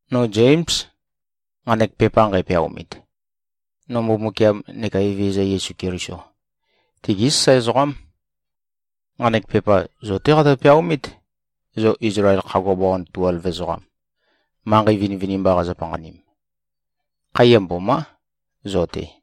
No Zéms, nqanek pepa nqæpeaomit. No Mbumbukiam neka Evezøza Yesu Keliso, tigí sasae ezoqám. Nqanek pepa zo-té qatø-peaomít, zo Izlael khagua bawan tuelv ezoqam, manqei vinivinimba qazo-panqanim. Khaiya mbomá, zo-te.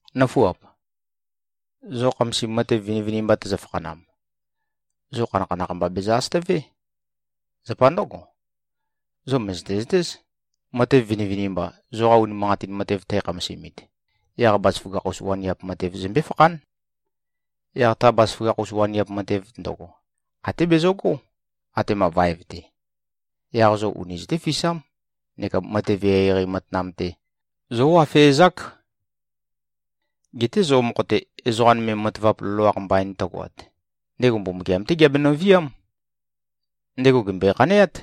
Nǿfuap! Zo khamasim matev vinivinimba tøzø-fakhanam, zo khanakhanakh mba bezø-asøtøvé. Zapa ndǿgo, zo mø̀zøte-zøtéz, matev vinivinimba, zoqa unimanqatin matev tækhamasimit, yaq bazaføgakh-us waniap matev zømbé-fakhán. Yaq ta bazaføgakh-us waniap matev ndøgo, até bezøgó, atema vaev-te. Yaq zo uni zøtéfisám neka matev eqeieqei matanam-te zówafezák. Geté zo mokho-te, ezoqa nøme matavap loloakh mbain tøgoat, ndego Mbumbukiam-té geabenøviám. Ndego gèmbøe-khaneát,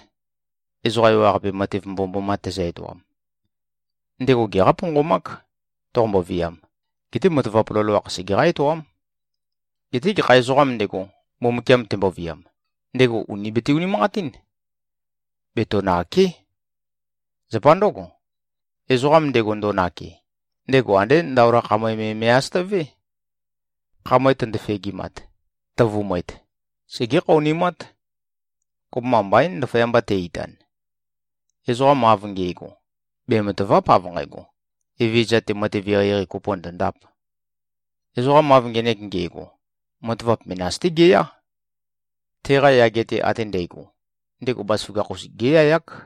ezoqa ewaqape matev mbomømboma tezø-etoam. Ndego geqá-ponqomák, toqombo-viam, geté matavap loloakh segeqá-etoám. Geté gekha ezoqām ndego, Mbumbukiam temboviam, ndego ùni bete-unimanqatín. Betonàke᷄. Zapa ndǿgo, ezoqam ndego, ndo꞉nake, ndego andé ndaola khamøe me me꞉-asøtavé. Khamøe tøndo-fegimat, tøvumøet, segé-khaonimát. Kopømba mbaín, ndaføyamba te-itan. Ezoqam av nge꞉go, bematàva᷄p, av nqægo, Evezøza-te matev eqeieqei kopo ndondāp. Ezoqam av ngenek nge꞉go, matavap menas-té geyá. Teqa yage-te ate ndægo, ndego bazaføgakh-us géyayák.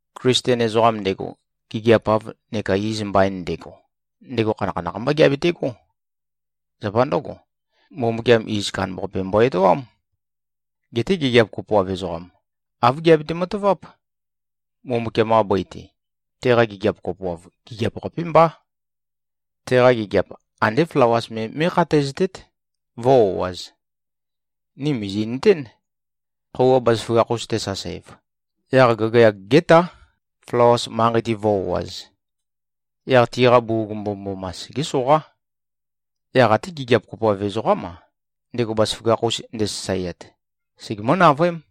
Klisten ezoqam ndego, gigiap-av neka iz mbain ndego, ndego khanakhanakh mbá geabetegó. Zapa ndǿgo, Mbumbukiam iz kandambaqape mbo-etoám. Geté gigiap kopoav ezoqam, āv geabete-mataváp: Mbumbukiam-qa bøi-te, teqa gigiap kopoav, gigiap-qapé mbá. Teqa gigiap andé flawas me mé꞉khataeztét, vǿ-o꞉āz. Ni mìzi꞉nøtén. Khøuwa bazaføgakh-us tesasev, yaq gagayag gétá, flawas manqei-te vǿ-o꞉āz. Yaq tiqa bugug mbomømboma segé-soqá. Yaq até gigiap kopoav ezoqám-a, ndego bazaføgakh-us ndesasaeat, segemǿ-navøém.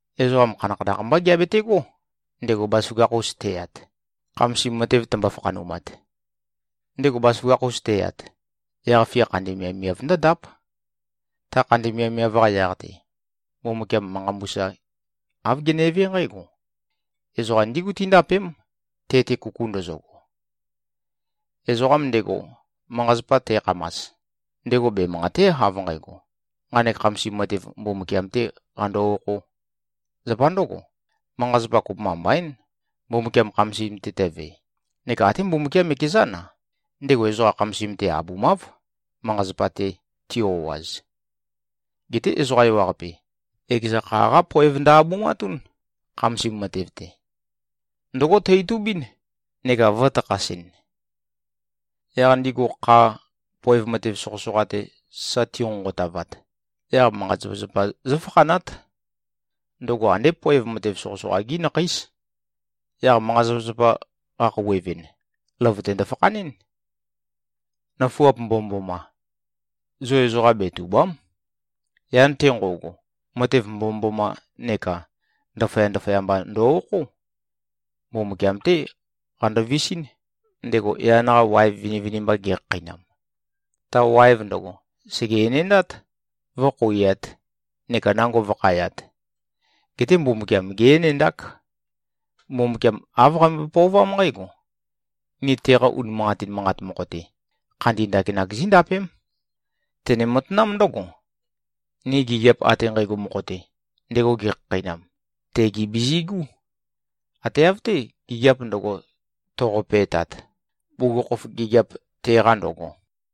Ezoqam khanakhanakh mbá geabetegó, ndego bazaføgakh-us teyat, khamasim matev tømbo-fakhanumat. Ndego bazaføgakh-us teyat, yaq-fia khandi miavmiav ndǿndáp. Ta khandi miavmiav-qa yaq-te, Mbumbukiam manqa mbusa, āv genevé nqǽgo: Ezoqa ndígu tíndapém, te-te kuku ndøzøgo. Ezoqam ndego, manqa-zapa tækhamas, ndego bemanqàte᷄, av nqægo, nqanek khamasim matev Mbumbukiam-tē qando-okhō. Zapa ndǿgo, manqa-zapa, kopømba mbaín, Mbumbukiam khamasim-te tøve, neka até Mbumbukiam ekezán-a, ndego ezoqa khamasim-te abumáv, manqa-zapa-te ti-o꞉az. Geté ezoqa ewaqape, ekeza kha-qá poev ndø-abumatún, khamasim matev-te. Ndǿgo tø-itubín neka vø̄takhasɨn. Yaq ndigu, kha, poev matev soqøsoqa-te, sa tinqonqotavat, yaq manqa-zapazapa zǿfakhanát. Ndøgo andé poev matev soqøsoqa-gí nakheís. Yaq manqa-zapazapa qakhouwevɨn, løvøte ndøfakhanɨ́n. Nøfuap mbomømboma! Zo ezoqa betùba᷄m. Yan-te nqo꞉go, matev mbomømboma neka ndaføya-ndaføya mba ndo-okhó. Mbumbukiam-té qando-visín, ndego yan-qa waev vinivinimba gekhakheinam. Ta waev ndøgo, sège-enendát, vø̄-khouiat, neka nango vø̄khayat. Geté Mbumbukiam gé-enendák. Mbumbukiam āv qambøe-pøovám nqǽgo: Ni teqa unimanqatin manqat mokho-te, khandi ndakinak zíndapém. Tene-matanám ndǿgo: Ni gigiap ate nqægo mokho-te, ndego gekhakheinam, tegi bizigú. Ate av-té, gigiap ndøgo, toqope꞉tat, bugukhokhof gigiap teqa ndøgo.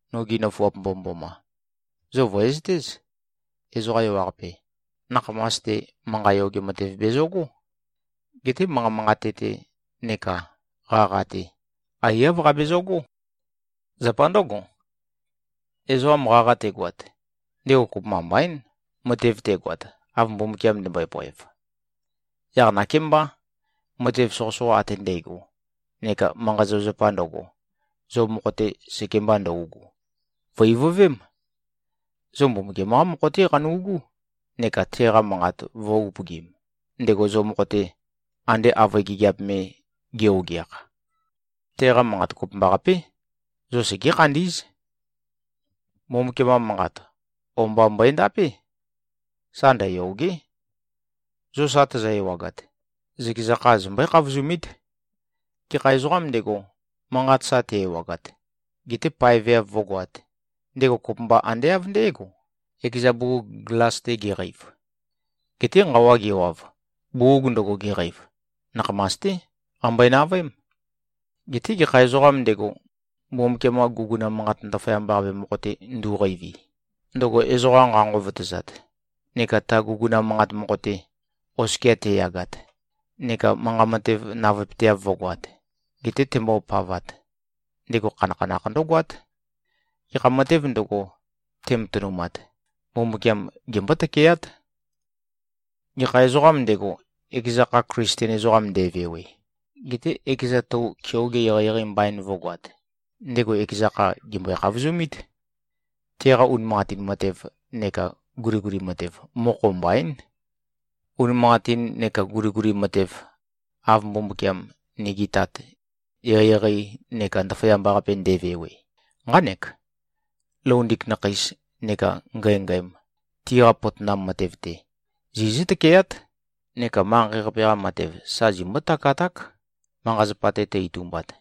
Nogi nøfuap mbomømboma! Zo vø̀ezøtéz. Ezoqa ewaqape, nakhamas-te, manqa yoge matev bezøgó. Geté manqa manqate-te neka qaqa-te, aiyáv qabezøgó. Zapa ndǿgo, ezoqam qaqa tegoat, ndego kopømba mbaín, matev tegoat, av Mbumbukiam ndømbøe-poev. Yaq nakémbá, matev soqøsoqa ate ndægo neka manqa-zapazapa ndøgo, zo mokho-te sekemba ndøugu, vø̀-ivøvém. Zo Mbumbukiam-qá mokho-té qanu꞉gú neka teqa manqat vø̄-upøgim, ndego zo mokho-te, ande avøe gigiap me, ge-ogeakh. Teqa manqat kopømbaqapé, zo segé-khandí꞉z. Mbumbukiam-qa Manqat, o-mba mbøendapé. Sa ndøyòge᷄. Zo sa tozo-ewagat, zøkeza kha zombøé-khavozumít. Gekha ezoqām ndego, manqat sa te-ewagat, gete paeveav vǿgoāt, ndego kopømba ande av ndé꞉go, ekeza bugug glas-te geqeiv. Geté nqawa gewav, bugug ndøgo geqeiv, nakhamas-té qambøe-navøém. Geté gekha ezoqām ndego, Mbumbukiam-qa guguna manqat ndaføyamba-qape mokho-te ndu꞉qeivi, ndøgo ezoqa nqa-nqovotøzat, neka ta guguna manqat mokho-te, oskia teyagat, neka manqa matev navøepøteav vǿgoāt, gete tembopavat, ndego khanakhanakh ndǿgoát. Gekha matēv ndøgo, tematønumat, Mbumbukiam gembó-tøkeát. Gekha ezoqām ndego, ekeza kha Klisten ezoqam nde꞉vewe, gete ekeza tou keoge eqeieqei mbain vǿgoāt, ndego ekeza kha, gèmbøe-khavozumít. Teqa unimanqatin matev neka guliguli matev, mokho mbaín. Unimanqatin neka guliguli matev, av Mbumbukiam, nigi Tat, eqeieqei neka ndaføyamba-qape nde꞉vewe, nqánek: Loundik nakheis neka ngængæm, tiqa potonam matev-te, zizǿ-tøkeát, neka manqei-qape-qa matev sa zimbó-takaták, manqa-zapa-te tø-itumbat.